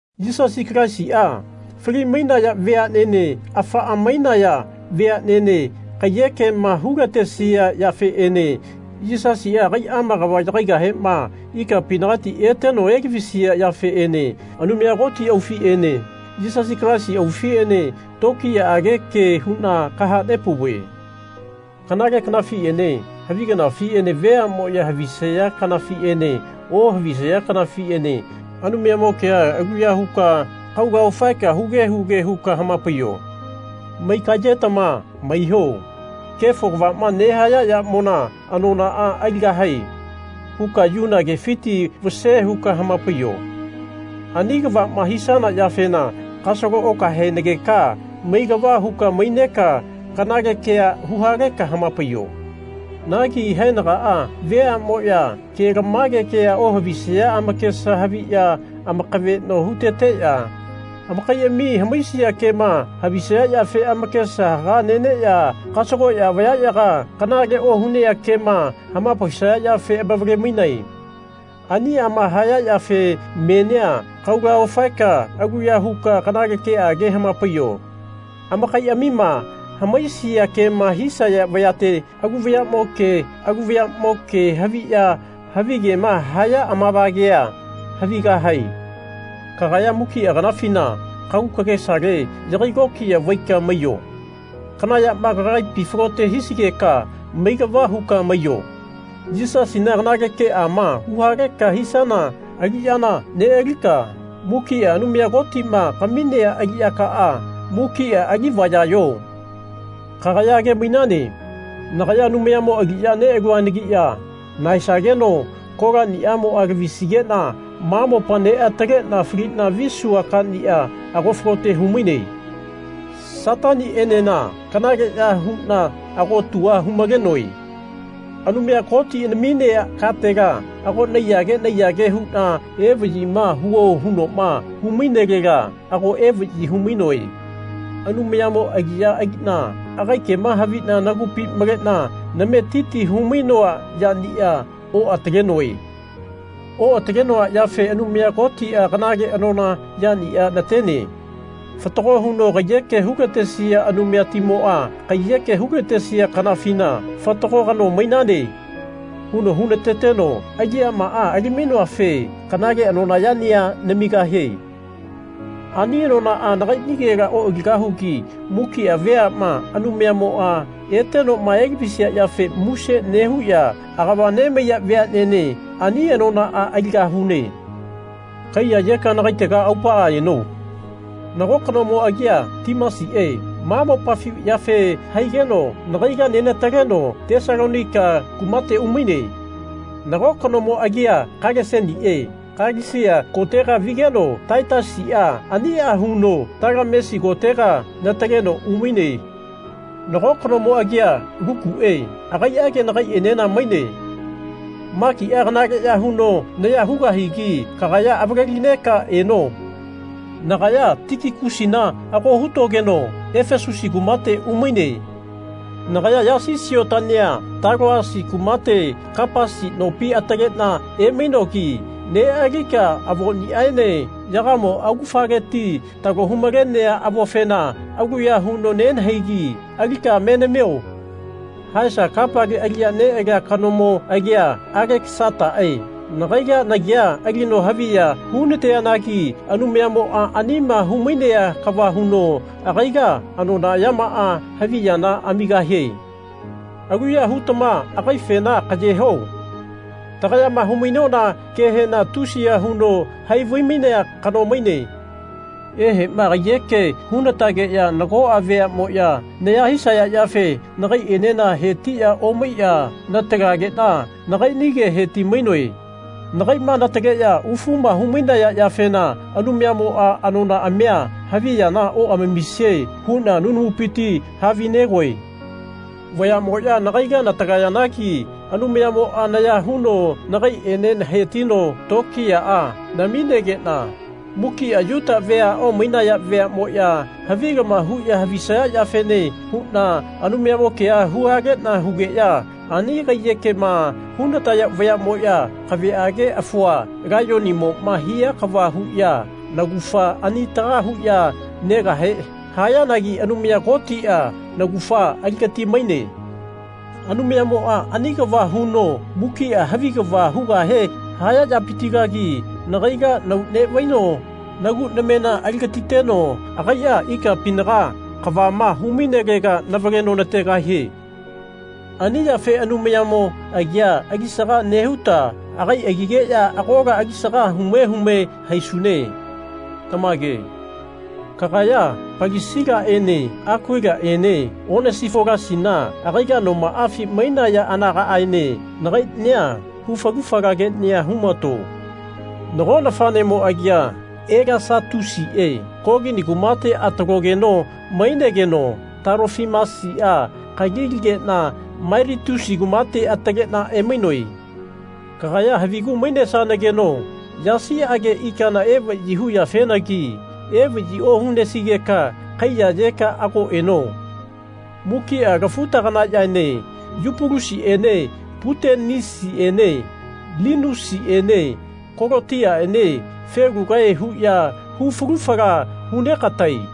Yisasi Kalaisia fali-mainaya veanene afaa mainaya veanene kaiyekema hulatesia yafeene Yisasia agaiama kava yagaigahema ikapinagati eteno elavisia yafeene Anumaya Koti aufiene Yisasi Kalaisi aufiene tokiyaage ke huna kahanepauve. Kanale kanafiene havi kanafiene veamoya havisaya kanafiene ohavisaya kanafiene Anumayamo kea aluya huka kaula ofaeka huge huge huka hamapaiyo. Maigayetama maiho. Kefo kavama nehaya yamona anonaa aligahae. huka yuna kefiti vase huka hamapaiyo. Ani kavama hisana yafena kasalo okahaenageka mailava huka maineka kanale kea huhaleka hamapaiyo. Nagi haenagaa veamoya kelamage kea ohavisaya amakesa haviya amakaveno huteteya amakaiami hamaisia kema havisaya yafe amakesa haga neneya kasagoya vayayaga kanale ohunea kema hamapaisaya yafe amavale-mainae. Aniama haya yafe menia kaula ofaeka aluya huka kanale keage hamapaiyo. amakaiamima hamaisia kema hisaya vayate alu vayamo ke alu vayamo ke haviya havigema haya amavagea havigahae. Kagaya mukia kanafina kagu kagesale yagai lokiya vaika maiyo. Kana yama kagaipi falote hisigeka mailava huka maiyo. Yisasina kanale keama huhaleka hisana aliyana nealika mukia Anumaya Kotima kaminea aliyakaa mukia alivayayo. Kagaya age-mainane nagaya Anumayamo aliya nealuanagiya nahaesageno kolania lavisigena ma mopa neatalena falina visua kania ago falote humaine. Satanienena kanaleya huna ago tua hu-malenoe. Anumaya Koti naminea katela ago naiyage naiyage huna evayima huo hunoma humainelela ago evayi humainoe. Anumayamo aliya alina agai kema havina nagupi malena nametiti humainoa yania oatalenoe. Oatalenoa yafe Anumaya Kotia kanale anona yania natene. Fatago huno kaiyeke hulatesia Anumayatimoa kaiyeke hulatesia kanafina Fatago kano mainane. huno hunateteno aliyamaa ali-mainoafe kanale anona yania namigahie. Ani anonaa nagainigela oaligahugi mukia veama Anumayamoa etenoma elavisia yafe muse nehuya agava nemaiya veanene ani anonaa aligahune. Kaiyayeka nakaitega aupaa eno. Nago kanomo agia Timasie ma mopafi yafe haigeno nagaila nenataleno Tesalonaika kumate umaine. Nako kanomo agia Kalesenie Kalesia kotega vigeno Taitasia ania huno Talamesi kotega nataleno umaine. Nago kanomo agia Lukue agaiage nagaienena maine. Makia kanaleya huno naya hugahigi kagaya avale-lineka eno. Nagaya Tikikusina ago hutogeno Efasusi kumate umaine. Nagaya yasi siotania Taloasi kumate Kapasi nopi atalena emainogi nealika avoniaene yagamo augafaleti talo hu-malenea avofena aluya huno nenahaigi alika me namio. Haesa kapale aliya nealia kanomo agia Alekasatae nagaila nagia alino haviya hunateanagi Anumayamoa anima humainea kava huno agaila anona yamaa havi yana amigahie. Aluya hutama agaifena kaye ho. Tagayama humainona kehena tusiya huno hai vai-mainea kano maine. Ehema kaiyeke hunatageya nagoa veamoya naya hisaya yafe nagaienena hetiya omaiya natalagena nagainige heti-mainoe. Nagaima nataleya ufuma humainaya yafena Anumayamoa anonaamia havi yana oamamisie huna nunamupiti havinegoe. Vayamoya nagaila natalayanagi Anumayamoa naya huno nagaiene hetino tokiyaa namigena mukia Yuta vea omainaya veamoya havilama huya havisaya yafene huna Anumayamo kea huhalena hugeya ani kaiyekema hunataya vayamoya kaveage afua laiyonimoma hia kava huya naugafa anitaga huya negahe hayanagi Anumaya Kotia naugafa aligati-maine. Anumayamoa ani kava huno mukia havi kava hugahe haya yapitilagi nagaila nau nevaino nagu namena aligatiteno agaia ikapinaga kavama hu-mainelega navaleno nategahie. Ani yafe Anumayamo agia alisaga nehuta agai agigeya agola alisaga hume hume haisune. Tamage. Kagaya Palisilaene Akuilaene Onesifolasina agaila nomaafi mainaya anagaaene nagainia hu falu fala kenia humato. Nago nafanemo agia Elasatusie Kolini kumate atalogeno mainegeno Talofimasia kali aligena Mailitusi kumate atalena emainoe. Kagaya havigu mainesanageno yasiage ikana evayi huyafenagi evayi ohunesigeka kaiyayeka ago eno. Mukia lafu-taganayaene Yupulusiene Putenisiene Linusiene Kolotiaene felugae huya hu fulu fala hunegatae.